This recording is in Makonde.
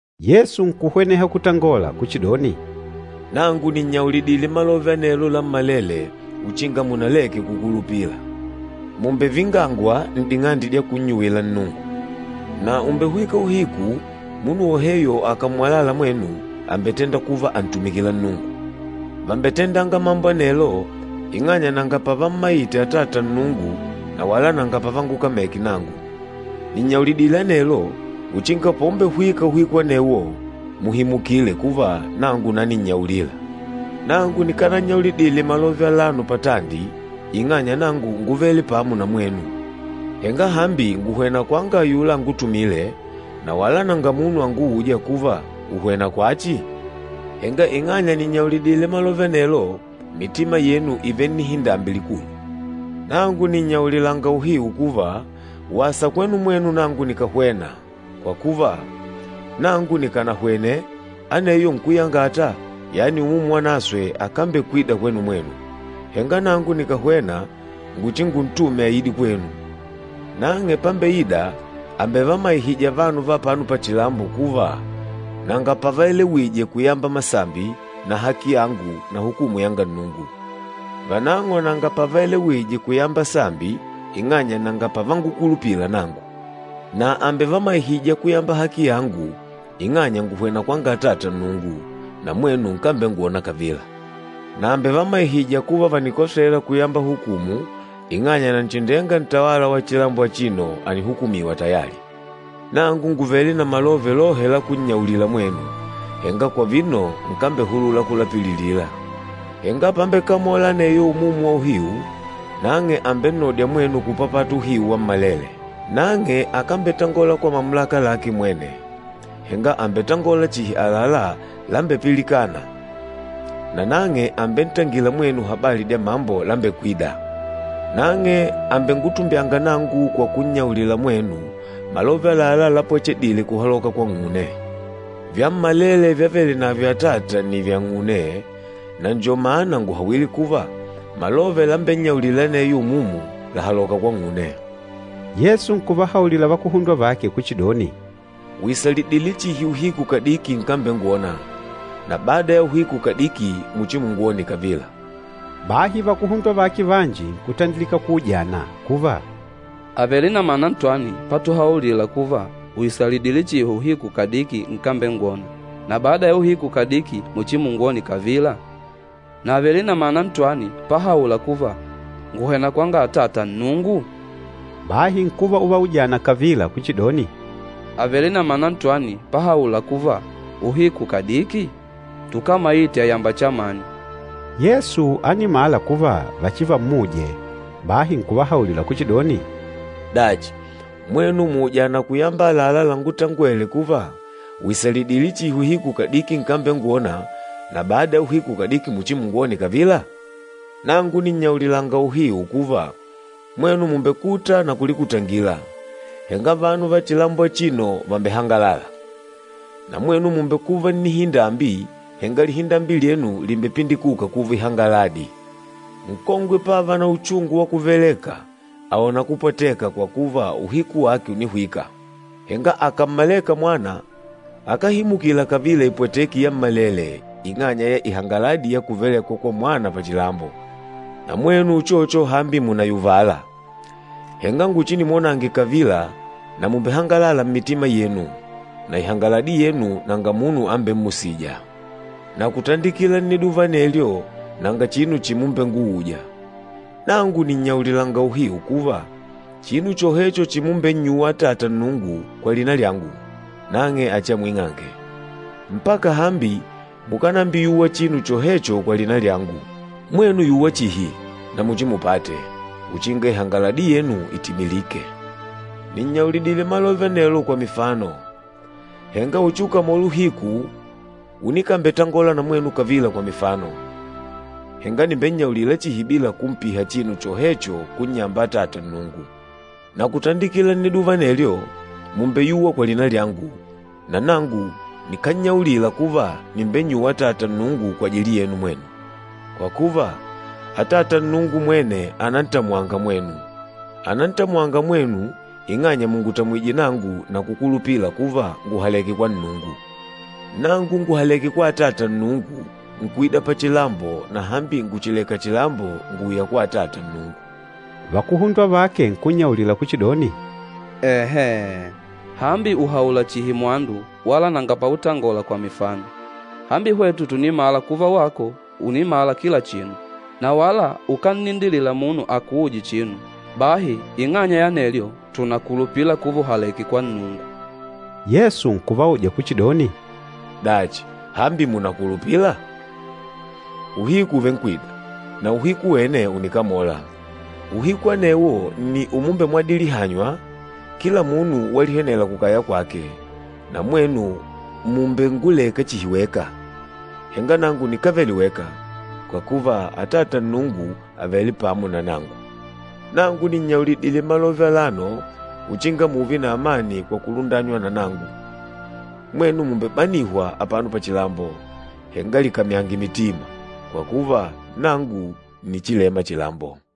Yesu nkuhweneha kutangola kuchidoni, “Nangu nìnnyaulidile malove anelo lammalele uchinga munaleke kukulupila. Mùmbevingangwa n'ding'ande dya kunnyuwila Nnungu. Na ùmbehwika uhiku, munu woheyo akàmmwalala mwenu àmbetenda kuva àntumikila Nnungu. Vàmbetendanga mambo anelo ing'anya nanga pavammaite Atata Nnungu na wala nanga pavangukameke nangu. Nìnnyaulidile anelo, uchinga paumbehwika uhiku anewo muhimukile kuva, nangu naninnyaulila.” “Nangu, nikanannyaulidile malove alano patandi ing'anya nangu ngúvele pamo na mwenu. Henga hambi ngùhwena kwanga ayula angutumîle na wala nanga munu angûja kuva, ‘Ùhwena kwachi?’ Henga ing'anya nìnnyaulidile malove anelo, mitima yenu ìvele nnihindambi likulu. Nangu nìnnyaulilanga uhiu kuva, wasa kwenu mwenu nangu nikàhwena, kwa kuva, nangu nikànahwene, aneyo Nkúyangata, yani Umumu Wanaswe akambekwida kwenu mwenu. Henga nangu nikàhwena nguchinguntume aide kwenu. Nang'e pámbeìdà àmbevamaihija vanu va apano pachilambo kuva nanga pavaelewije kuyamba masambi na haki yangu na hukumu yanga Nnungu. Vanang'o nanga pavaelewije kuyamba sambi ing'anya nanga pavangukulupila nangu. Na àmbevamaihija kuyamba haki yangu ing'anya ngùhwena kwanga Atata Nnungu, na mwenu nkambengwona kavila. Na àmbevamaihija kuva vànikosela kuyamba hukumu, ing'anya Nanchindenga, ntawala wa chilambo achino ànihukumiwa tayali. Nangu ngùvele na malove lohe lakunnyaulila mwenu, henga kwa vino nkambehulula kulapililila. Henga pámbekamòlà aneyo Umumu wa uhiu, nang'e àmbennodya mwenu kupapata uhiu wammalele. Nang'e akambetangola kwa mamulaka lake mwene, henga àmbetangola chihi àlalá lambepilikâna, nanang'e àmbentangila mwenu habali dya mambo lambekwîda. Nang'e àmbengutumbyanga nangu kwa kunnyaulila mwenu malove àlalá lápwechedìlè kuhaloka kwang'une. Vyammalele vyavele navyo Atata nni vyang'une, na njo mana ngùhawile kuva malove lambennyaulîla aneyo Umumu làhaloka kwang'une.” Yesu nkuvahaulila vakuhundwa vake kuchidoni, “Ùisalidile chihi uhiku kadiki nkambengwona, na bada ya uhiku kadiki muchimungwone kavila!” Bahi vakuhundwa vake vanji nkutandilika kuujana kuva, “Àvele na mana ntwani patuhaulila kuva, ‘Ùisalidile chihi uhiku kadiki nkambengwona, na bada ya uhiku kadiki muchimungwone kavila?’ Na àvele na mana ntwani pahaula kuva, ‘Ngùhwena kwanga Atata Nnungu?’” Bahi nkuva uvaujana kavila kuchidoni, “Àvele na mana ntwani pahaula kuva, ‘uhiku kadiki?’ Tukámaite àyamba chamani.” Yesu ánimala kuva vachivammuje, bahi nkuvahaulila kuchidoni, “Dachi, mwenu mùujana kuyamba àlalá langútangwèlè kuva, ‘Ùisalidile chihi uhiku kadiki nkambengwona, na bada ya uhiku kadiki muchimungwone kavila?’ Nangu nìnnyaulilanga uhiu kuva, mwenu mùmbekuta na kulikutangila, henga vanu va chilambo achino vàmbehangalala. Na mwenu mùmbekuva nnihindambi, henga lihindambi lyenu lìmbepindikuka kuva ihangaladi. Nkongwe pávà na uchungu wa kuveleka, àona kupwateka kwa kuva uhiku wake ùnihwika. Henga akàmmaleka mwana, akáhimukila kavila ipweteki yammalele ing'anya ya ihangaladi ya kuvelekwa kwa mwana pachilambo. Na mwenu uchocho hambi mùnayuvala, henga nguchinimwonange kavila, na mùmbehangalala mmitima yenu, na ihangaladi yenu nanga munu ambemmusija. Na kutandikila nniduva anelyo nanga chinu chimumbenguuja. Nangu nìnnyaulilanga uhiu kuva, chinu chohecho chimumbennyuwa Atata Nnungu kwa lina lyangu, nang'e achiamwing'ange. Mpaka hambi mukánambiyuwa chinu chohecho kwa lina lyangu. Mwenu yuwa chihi, na muchimupate, uchinga ihangaladi yenu itimilike.” “Nìnnyaulidile malove anelo kwa mifano. Henga uchiukamole uhiku unikambetangola na mwenu kavila kwa mifano, henga nìmbennyaulila chihi bila kumpiha chinu chohecho kunnyamba Atata Nnungu. Na kutandikila nniduva anelyo, mùmbeyuwa kwa lina lyangu, na nangu nikánnyaulila kuva nìmbennyuwa Atata Nnungu kwajili yenu mwenu. Kwa kuva, Atata Nnungu mwene ànantamwanga mwenu. Ànantamwanga mwenu ing'anya mùngutamwije nangu na kukulupila kuva ngùhaleke kwa Nnungu. Nangu ngùhaleke kwa Atata Nnungu, nkuida pachilambo, na hambi ngùchileka chilambo, ngùuya kwa Atata Nnungu.” Vakuhundwa vake nkunnyaulila kuchidoni, “Enhee! Hambi ùhaula chihi mwandu wala nanga pautangola kwa mifano. Hambi hwetu tùnimala kuva wako ùnimala kila chinu, na wala ukánnindilila munu akuuje chinu. Bahi ing'anya ya anelyo, tùnakulupila kuva ùhaleke kwa Nnungu.” Yesu nkuvauja kuchidoni, “Dachi, hambi mùnakulupila? Uhiku ùvenkwida, na uhiku wene ùnikamola, uhiku anewo nni umumbemwadilihanywa, kila munu walihwenela kukaya kwake, na mwenu mùmbenguleka chihi weka. Henga nangu nikávele weka, kwa kuva Atata Nnungu àvele pamo na nangu. Nangu nìnnyaulidile malove alano uchinga mùùve na amani kwa kulundanywa na nangu. Mwenu mùmbebanihwa apano pachilambo, henga likamyange mitima, kwa kuva nangu ǹnichilema chilambo.”